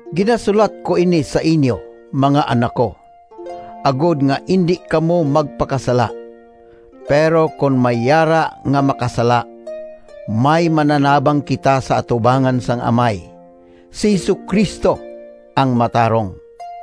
Ginasulat ko ini sa inyo, mga anak ko, agod nga indi kamo magpakasala. Pero kon may yara nga makasala, may mananabang kita sa atubangan sang Amay, si Jesu-Cristo, ang matarong.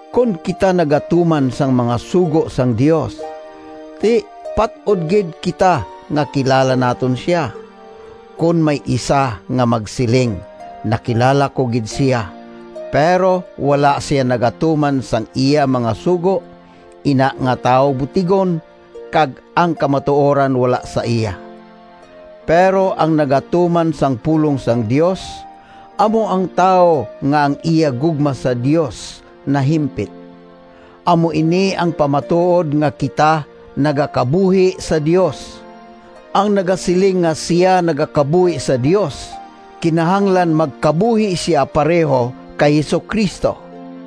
Kon kita nagatuman sang mga sugo sang Dios, ti, pat-od gid kita nga kilala naton sia. Kon may isa nga magsiling, “Nakilala ko gid sia,” pero wala sia nagatuman sang iya mga sugo, ina nga tawo butigon kag ang kamatuoran wala sa iya. Pero ang nagatuman sang pulong sang Dios, amo ang tawo nga ang iya gugma sa Dios nahimpit. Amo ini ang pamatuod nga kita nagakabuhi sa Dios. Ang nagasiling nga sia nagakabuhi sa Dios, kinahanglan magkabuhi sia pareho kay Jesu-Cristo.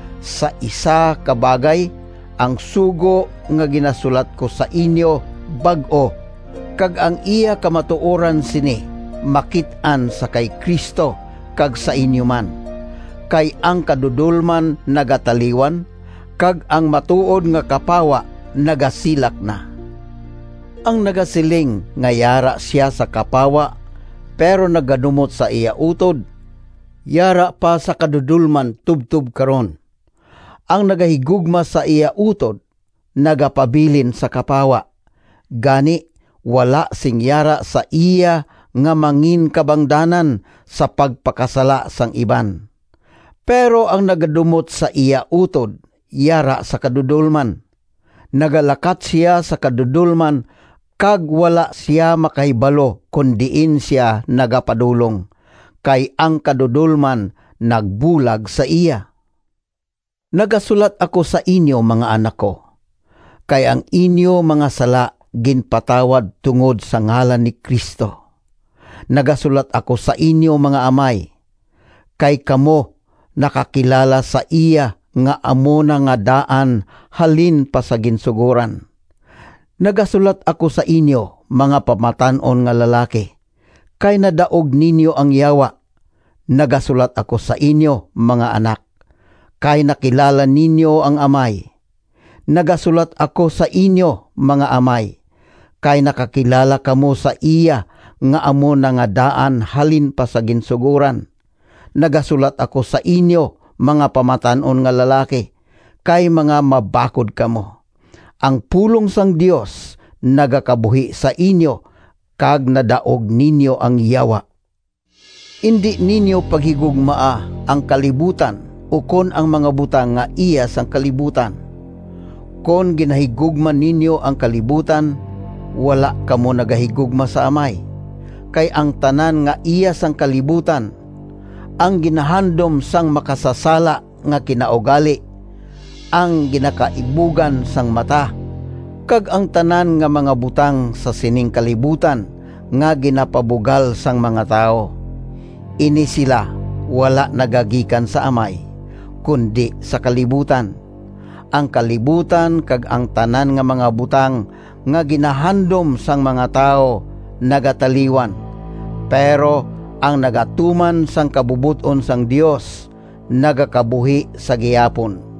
Sa isa ka bagay, ang sugo nga ginasulat ko sa inyo bag-o, kag ang iya kamatuoran sini makit-an sa kay Cristo kag sa inyo man. Kay ang kadudolman nagataliwan, kag ang matuod nga kapawa nagasilak na. Ang nagasiling nga yara sia sa kapawa, pero nagadumot sa iya utod, yara pa sa kadudolman tubtob karon. Ang nagahigugma sa iya utod nagapabilin sa kapawa, gani wala sing yara sa iya nga manginkabangdanan sa pagpakasala sang iban. Pero ang nagadumot sa iya utod yara sa kadudolman. Nagalakat sia sa kadudolman kag wala sia makahibalo kon diin sia nagapadulong, kay ang kadudolman nagbulag sa iya. Nagasulat ako sa inyo, mga anak ko, kay ang inyo mga sala ginpatawad tungod sa ngalan ni Cristo. Nagasulat ako sa inyo, mga amay, kay kamo nakakilala sa iya nga amo na nga daan halin pa sa ginsugoran. Nagasulat ako sa inyo, mga pamatan-on nga lalaki, kay nadaog ninyo ang Yawa. Nagasulat ako sa inyo, mga anak, kay nakilala ninyo ang Amay. Nagasulat ako sa inyo, mga amay, kay nakakilala kamo sa iya nga amo na nga daan halin pa sa ginsugoran. Nagasulat ako sa inyo, mga pamatan-on nga lalaki, kay mga mabakod kamo. Ang pulong sang Dios nagakabuhi sa inyo kag nadaog ninyo ang Yawa. Indi ninyo paghigugmaa ang kalibutan ukon ang mga butang nga iya sang kalibutan. Kon ginahigugma ninyo ang kalibutan, wala kamo nagahigugma sa Amay. Kay ang tanan nga iya sang kalibutan—ang ginahandom sang makasasala nga kinaugali, ang ginakaibugan sang mata, kag ang tanan nga mga butang sa sining kalibutan nga ginapabugal sang mga tawo—ini sila wala nagagikan sa Amay, kundi sa kalibutan. Ang kalibutan kag ang tanan nga mga butang nga ginahandom sang mga tawo nagataliwan, pero ang nagatuman sang kabubot-on sang Dios nagakabuhi sa gihapon.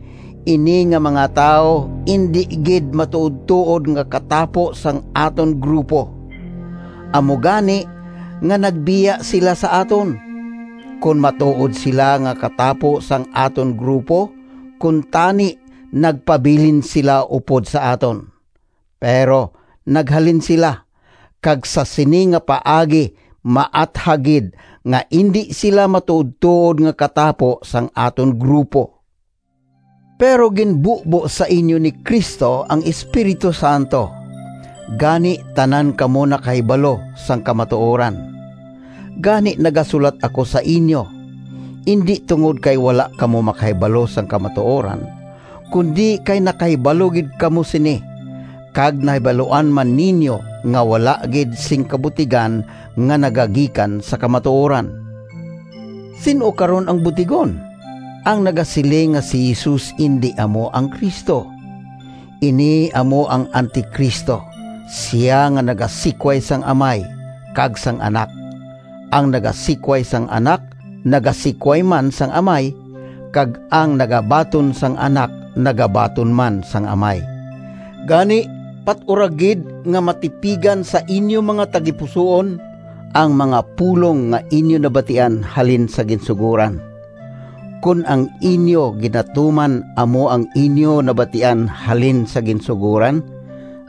Ini nga mga tawo indi gid matuodtuod nga katapo sang aton grupo, amo gani nga nagbiya sila sa aton. Kon matuod sila nga katapo sang aton grupo, kuntani nagpabilin sila upod sa aton. Pero naghalin sila, kag sa sini nga paagi maathag gid nga indi sila matuodtuod nga katapo sang aton grupo. Pero ginbubo sa inyo ni Cristo ang Espiritu Santo, gani tanan kamo nakahibalo sang kamatuoran. Gani nagasulat ako sa inyo, indi tungod kay wala kamo makahibalo sang kamatuoran, kundi kay nakahibalo gid kamo sini, kag nahibaluan man ninyo nga wala gid sing kabutigan nga nagagikan sa kamatuoran. Sin-o karon ang butigon? Ang nagasiling nga si Jesus indi amo ang Cristo. Ini amo ang Anti-Cristo, sia nga nagasikway sang Amay kag sang Anak. Ang nagasikway sang Anak, nagasikway man sang Amay, kag ang nagabaton sang Anak nagabaton man sang Amay. Gani pat-ura gid nga matipigan sa inyo mga tagipusoon ang mga pulong nga inyo nabatian halin sa ginsugoran. Kon ang inyo ginatuman amo ang inyo nabatian halin sa ginsugoran,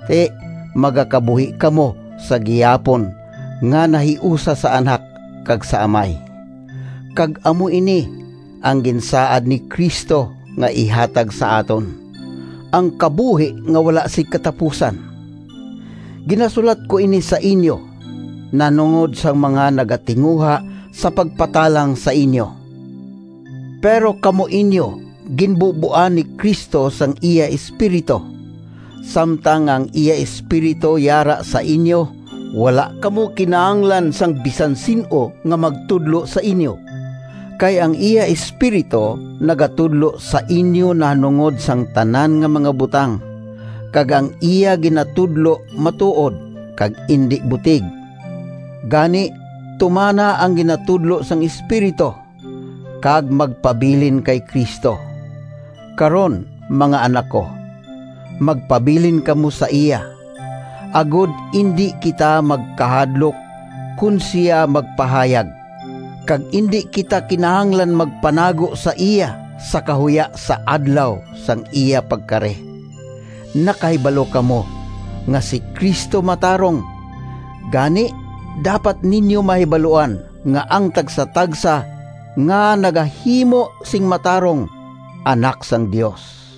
ti magakabuhi kamo sa gihapon nga nahiusa sa Anak kag sa Amay. Kag amo ini ang ginsaad ni Cristo nga ihatag sa aton—ang kabuhi nga wala sing katapusan. Ginasulat ko ini sa inyo nahanungod sang mga nagatinguha sa pagpatalang sa inyo. Pero kamo inyo ginbuboan ni Cristo sang iya Espiritu. Samtang nga ang iya Espiritu yara sa inyo, wala kamo kinahanglan sang bisan sin-o nga magtudlo sa inyo. Kay ang iya Espiritu nagatudlo sa inyo nahanungod sang tanan nga mga butang, kag ang iya ginatudlo matuod, kag indi butig. Gani tumana ang ginatudlo sang Espiritu, kag magpabilin kay Cristo. Karon, mga anak ko, magpabilin kamo sa iya, agod indi kita magkahadlok kon sia magpahayag, kag indi kita kinahanglan magpanago sa iya sa kahuya sa Adlaw sang iya pagkari. Nakahibalo kamo nga si Cristo matarong, gani dapat ninyo mahibaluan nga ang tagsatagsa nga nagahimo sing matarong anak sang Dios.